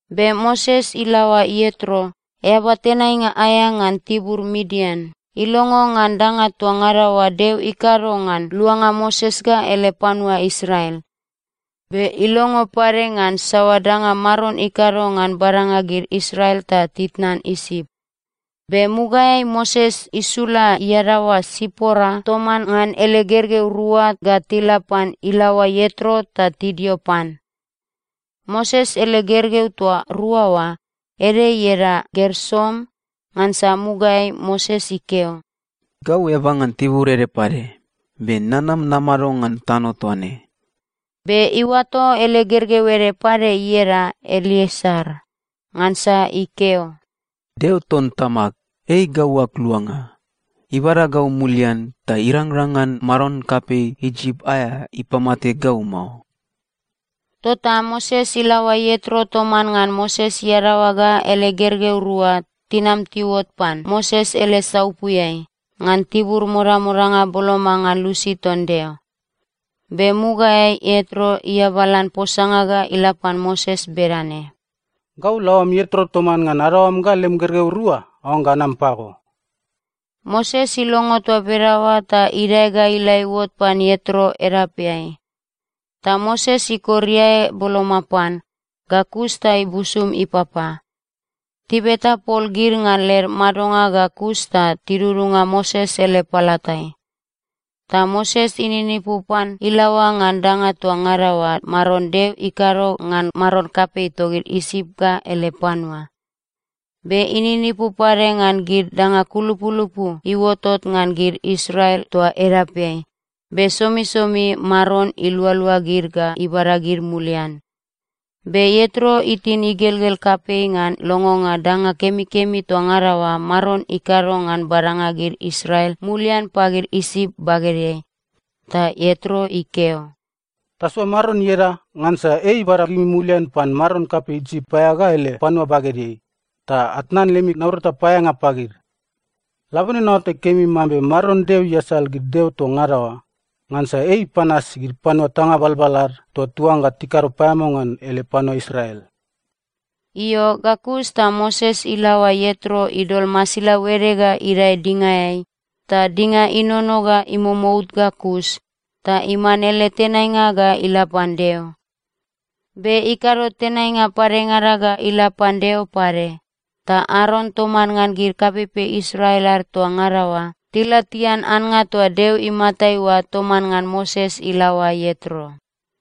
Be Moses ilaoa Ietro, eaba tenainga aea ngan tibur Midian, ilongo ngan danga toa ngada oa Deo ikado ngan luanga Moses ga ele panua Israel. Be ilongo pade ngan saoa danga Maron ikado ngan badanga gid Israel ta titnan Isip. Be mugaeai Moses isula iadaoa Sipora toman ngan ele gergeu rua ga tila pan ilaoa Ietro ta tidio pan. Moses ele gergeu toa rua oa, ede ieda Gersom, ngansa mugaeai Moses ikeo, “Gau eaba ngan tibur ede pade, be nanam namado ngan tano toa ne.” Be iuato ele gergeu ede pade ieda Elieser, ngansa ikeo, “Deo ton tamag, ei gau ag luanga. Ibada gau mulian, ta irangrang ngan maron kapei Isip aea ipamate gau mao.” Tota Moses ilaoa Ietro toman ngan Moses iadaoa ga ele gergeu rua tinam tiuot pan Moses ele saupuiai ngan tibur modamodanga boloma ngan lusi ton Deo. Be mugaeai Ietro iabalan posanga ga ila pan Moses bedane, “Gau laoam Ietro toman ngan adaoam ga lem gergeu rua aoangga anam pago.” Moses ilongo toa bedaoa ta idae ga ila iuot pan Ietro edapeai. Ta Moses ikor iae boloma pan. Ga kus ta ibusum ipapa. Tibeta pol gid ngan led madonga ga kus ta tidudunga Moses ele palatai. Ta Moses ininipu pan ilaoa ngan danga toa ngada oa Maron Deo ikado ngan maron kapei togid Isip ga ele panua. Be ininipu pade ngan gid danga kulupulupu iuotot ngan gid Israel toa edapeai, be somisomi Maron ilualua gid ga ibada gid mulian. Be Ietro itin igelgel kapei ngan longonga danga kemikemi toa ngada oa Maron ikado ngan badanga gid Israel mulian pagid Isip bagedeai. Ta Ietro ikeo, “Tasoa Maron ieda, ngansa ei ibada gimi mulian pan maron kapei Isip aea ga ele panua bagedeai, ta atnan lemi naurata paeaeanga pagid. Labone naoatai kemi mambe Maron Deo iasal gid deo toa ngada oa, ngansa ei ipanas gid panua tanga balbal ad toa tiuangga tikado paeamao ngan ele panua Israel.” Io, ga kus ta Moses ilaoa Ietro idol masilau ede ga idae dingaeai, ta dinga inono ga imomout ga kus ta iman ele tenainga ga ila pan Deo. Be ikado tenainga padengada ga ila pan Deo pade. Ta Aron toman ngan gid kapeipei Israel ad toa ngada oa tila tian annga toa Deo imatai oa toman ngan Moses ilaoa Ietro.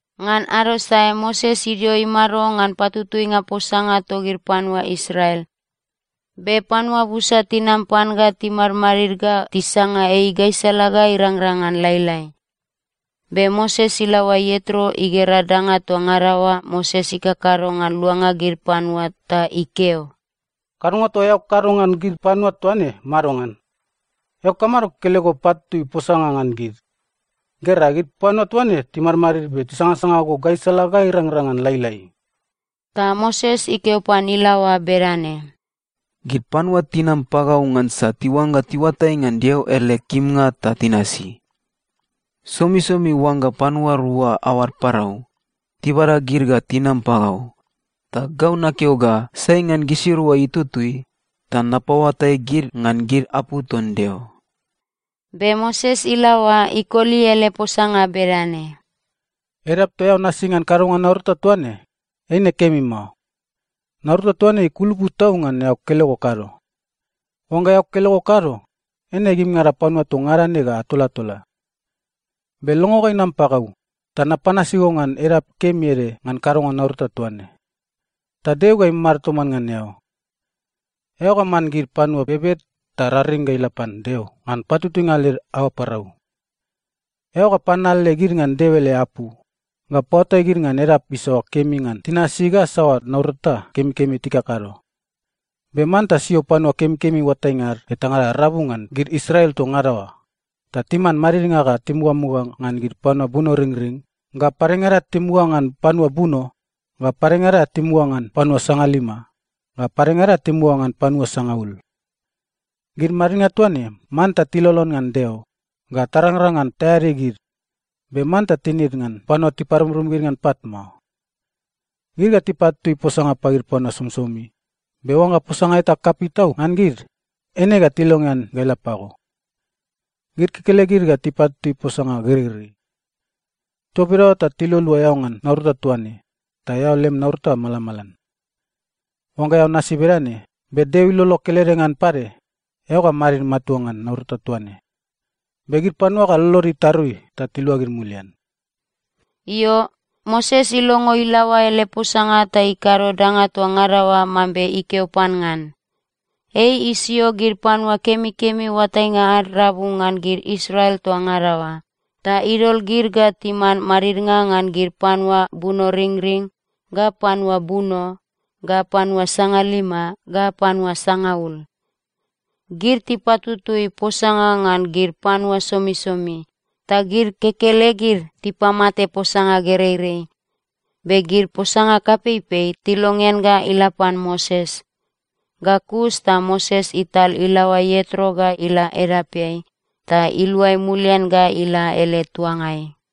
Ngan ado sae Moses idio imado ngan patutuinga posanga togid panua Israel. Be panua busa tinam pan ga timadmadid ga tisanga ei gaisala ga irangrang ngan lailai. Be Moses ilaoa Ietro igera danga toa ngada oa Moses ikakado ngan luanga gid panua ta ikeo, “Kadonga toa eao kakado ngan gid panua toa ne madongan? Eao kamado kekelego patutui posanga ngan gid? Gera, gid panua toa ne timadmadid be tisangasanga go gaisala ga irangrang ngan lailai.” Ta Moses ikeo pan ilaoa bedane, “Gid panua tinam pagau ngansa tiuangga tiuatai ngan Deo ele kimnga ta tinasi. Somisomi oangga panua rua aoad parau, tibada gid ga tinam pagau, ta gau nakeo ga sai ngan gisirua itutui, ta napaoatai gid ngan gid apu ton Deo.” Be Moses ilaoa ikoli ele posanga bedane, “Edap toa eao nasi ngan kadonga naurata toa ne, eine kemi mao. Naurata toa ne ikulupu tau ngan eao kekelego kado. Oangga eao kekelego kado, eine gimingada panua toa ngada ne ga atolatola. Be longo ga inam pagau, ta napanasi go ngan edap kemi ede ngan kadonga naurata toa ne. Ta Deo ga imamado toman ngan eao. Eao ga man gid panua bebed ta raring ga ila pan Deo ngan patutuinga led aoa parau. Eao ga pananale gid ngan Deo ele apu, ga paoatai gid ngan edap isaoa kemi ngan tinasi ga saoa naurata kemikemi tikakado. Be manta sio panua kemikemi oatainga ad etangada rabu ngan gid Israel toa ngada oa, ta timan madidnga ga timugamuga ngan gid panua bunoringring, ga padengada timuga ngan panua buno, ga padengada timuga ngan panua sangalima, ga padengada timuga ngan panua sangaul. Gid madidnga toa ne, manta tilolon ngan Deo, ga tarangrang ngan taeadi gid, be manta tinid ngan panua tiparumrum gid ngan pat mao. Gid ga tipatutui posanga pagid panua somisomi, be oangga posanga eta kapei tau ngan gid, eine ga tilongean ga ila pago. Gid kekelegid ga tipatutui posanga gereirei. Toa bedaoa ta tilualua eao ngan naurata toa ne, ta eao lem naurata malamalan. Oangga eao nasi bedane, be Deo ilolo kelede ngan pade, eao ga madid matua ngan naurata toa ne, be gid panua ga lolod itarui ta tiluagid mulian.” Io, Moses ilongo ilaoa ele posanga ta ikado danga toa ngada oa mambe ikeo pan ngan. Ei isio gid panua kemikemi oatainga ad rabu ngan gid Israel toa ngada oa, ta idol gid ga timan madidnga ngan gid panua bunoringring, ga panua buno, ga panua sangalima, ga panua sangaul. Gid tipatutui posanga ngan gid panua somisomi. Ta gid kekelegid tipamate posanga gereirei. Be gid posanga kapeipei, tilongean ga ila pan Moses. Ga kus ta Moses ital ilaoa Ietro ga ila edapeai, ta iluai mulian ga ila ele tuangai.